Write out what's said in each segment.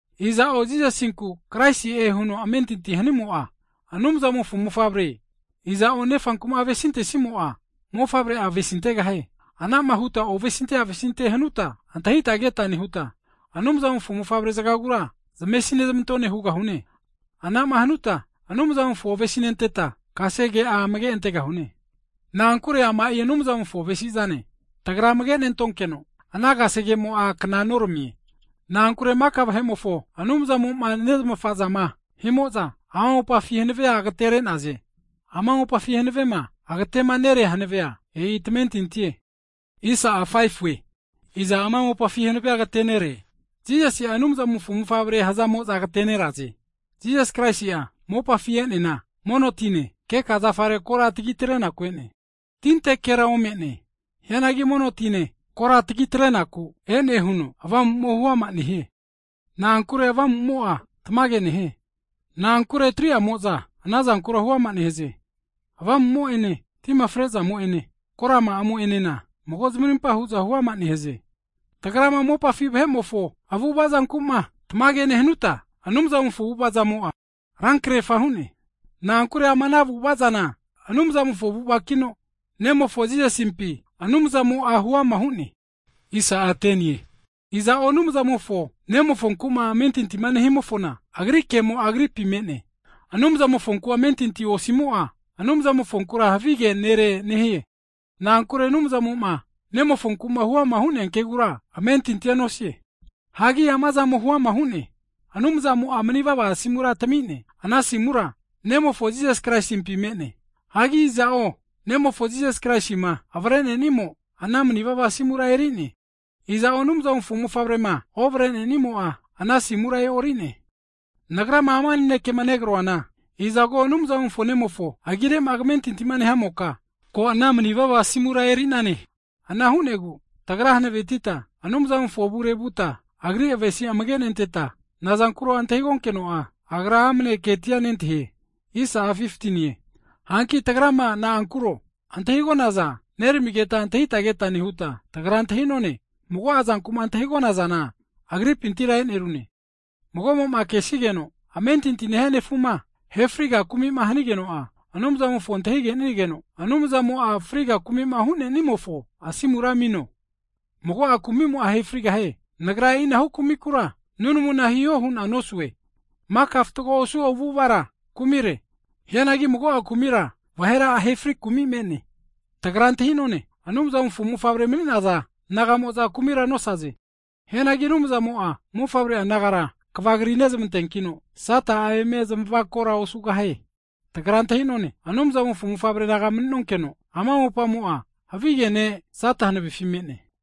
Iza'o Jisasinku Kraisi'e huno amentinti hanimo'a, Anumzamofo mofavre. Iza'o Nefanku'ma avesintesimo'a, Mofavre'a avesintegahie Anama huta ovesinte avesinte hanuta antahita keta nehuta, Anumzamofo mofavre zagagura zamesi nezmantone hugahune. Anama hanuta Anumzamofo avesinenteta, kasege'a amage antegahune. Na'ankure ama'i Anumzamofo avesi'zane, tagra amage nentonkeno, ana kasege'amo'a kna noramie. Na'ankure maka vahe'mo'za Anumzamo'ma nezmafa'zama himo'za, ama mopafi hanavea agateneraze. Ama mopafi hanavema agatemanerea hanavea, e'i tamentintie. Iza ama mopafi hanave agatenere? Jisasinku'ma Anumzamofo mofavre hazamo'za agateneraze. Jisas Kraisi'a mopafi e'neana, mono tine, keka zafare kora tagi atrenaku e'ne, tintekera ome'ne. Hianagi mono tine kora tagi atrenaku e'ne huno, Avamu'mo huama nehie. Na'ankure Avamu'mo'a tamage nehie. Na'ankure 3'amo'za ana zankura huama nehaze, Avamu'mo'ene, tima frezamo'ene, korama'amo enena mago zamarimpa hu'za huama nehaze. Tagrama mopafi vahe'mofo avu'avazanku'ma tamage nehanuta, Anumzamofo avu'avazamo'a rankrefa hu'ne. Na'ankure ama ana avu'ava zana Anumzamofo avu'avakino, Nemofo Jisasimpi Anumzamo'a huama hu'ne. Iza'o Anumzamofo nemofonte'ma amentinti nehimofona Agri kemo'a anamofompi me'ne, Anumzamofonte'ma amentinti osimo'a, Anumzamofonkura havige nere nehie. Na'ankure Anumzamo'ma Nemofonku'ma huama hu'nea kegura amentintia nosie. Hagi amazamo huama hu'ne, Anumzamo'a manivava asimura tami'ne, ana asimura Nemofo Jisas Kraisimpi me'ne. Hagi iza'o Nemofo Jisasi Kraisima avare'nenimo, ana manivava asimura eri'ne. Iza'o Anumzamofo mofavrema ovare'nenimo'a, ana asimura e'ori'ne. Nagrama ama nanekema negroana, izago Anumzamofo Nemofo agire'ma kamentinti nehamoka, ko ana manivava asimura eri'nane. Ana hu'negu tagra hanavetita Anumzamofo avure vuta, Agri avesi'zamofo amage nenteta, nazankuro antahigonkeno'a, agra amane ketia nentahie. Hagi tagrama na'ankuro antahigonaza neramigeta antahita keta nehuta, tagra antahi'none mago'a zanku'ma antahigonazana Agripintira e'nerune. Mago'mo'ma kesigeno, amentinti nehia nefu'ma ahe friga kumi'ma hanigeno'a, Anumzamofo antahigenigeno Anumzamo'a friga kumi'ma hu'nenimofo asimura amino, mago'a kumimo'a ahe frigahie. Nagra e'inahu kumikura nunamuna hino hu'na nosue. Maka fatgo osu avu'avara kumire, hianagi mago'a kumira vahera ahe ofri kumi me'ne. Tagra antahi'none, Anumzamofo mofavre mani'naza naga'mo'za kumira nosaze, hianagi Anumzamo'a mofavre'a nagara kva kri nezmanteankino, Sata'a eme zamavakora osugahie. Tagra antahi'none, Anumzamofo mofavre naga mani'nonkeno, ama mopamo'a havige ne' Sata hanavefi me'ne.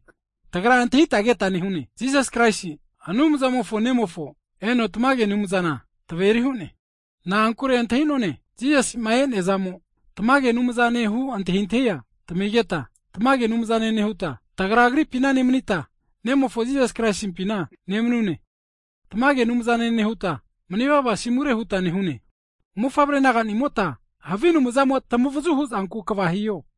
Tagra antahita keta nehune, Jisas Kraisi, Anumzamofo Nemofo eno tamage Anumzana taveri hu'ne. Na'ankure antahi'none, Jisasi'ma e'neazamo tamage Anumzanehu antahintahia tamigeta, tamage Anumzane nehuta, tagra Agripina nemanita, Nemofo Jisas Kraisimpina nemanune. Tamage Anumzane nehuta manivava asimure huta nehune. Mofavre naganimota, havi anumzamo tamavazu hu'zanku kva hiho.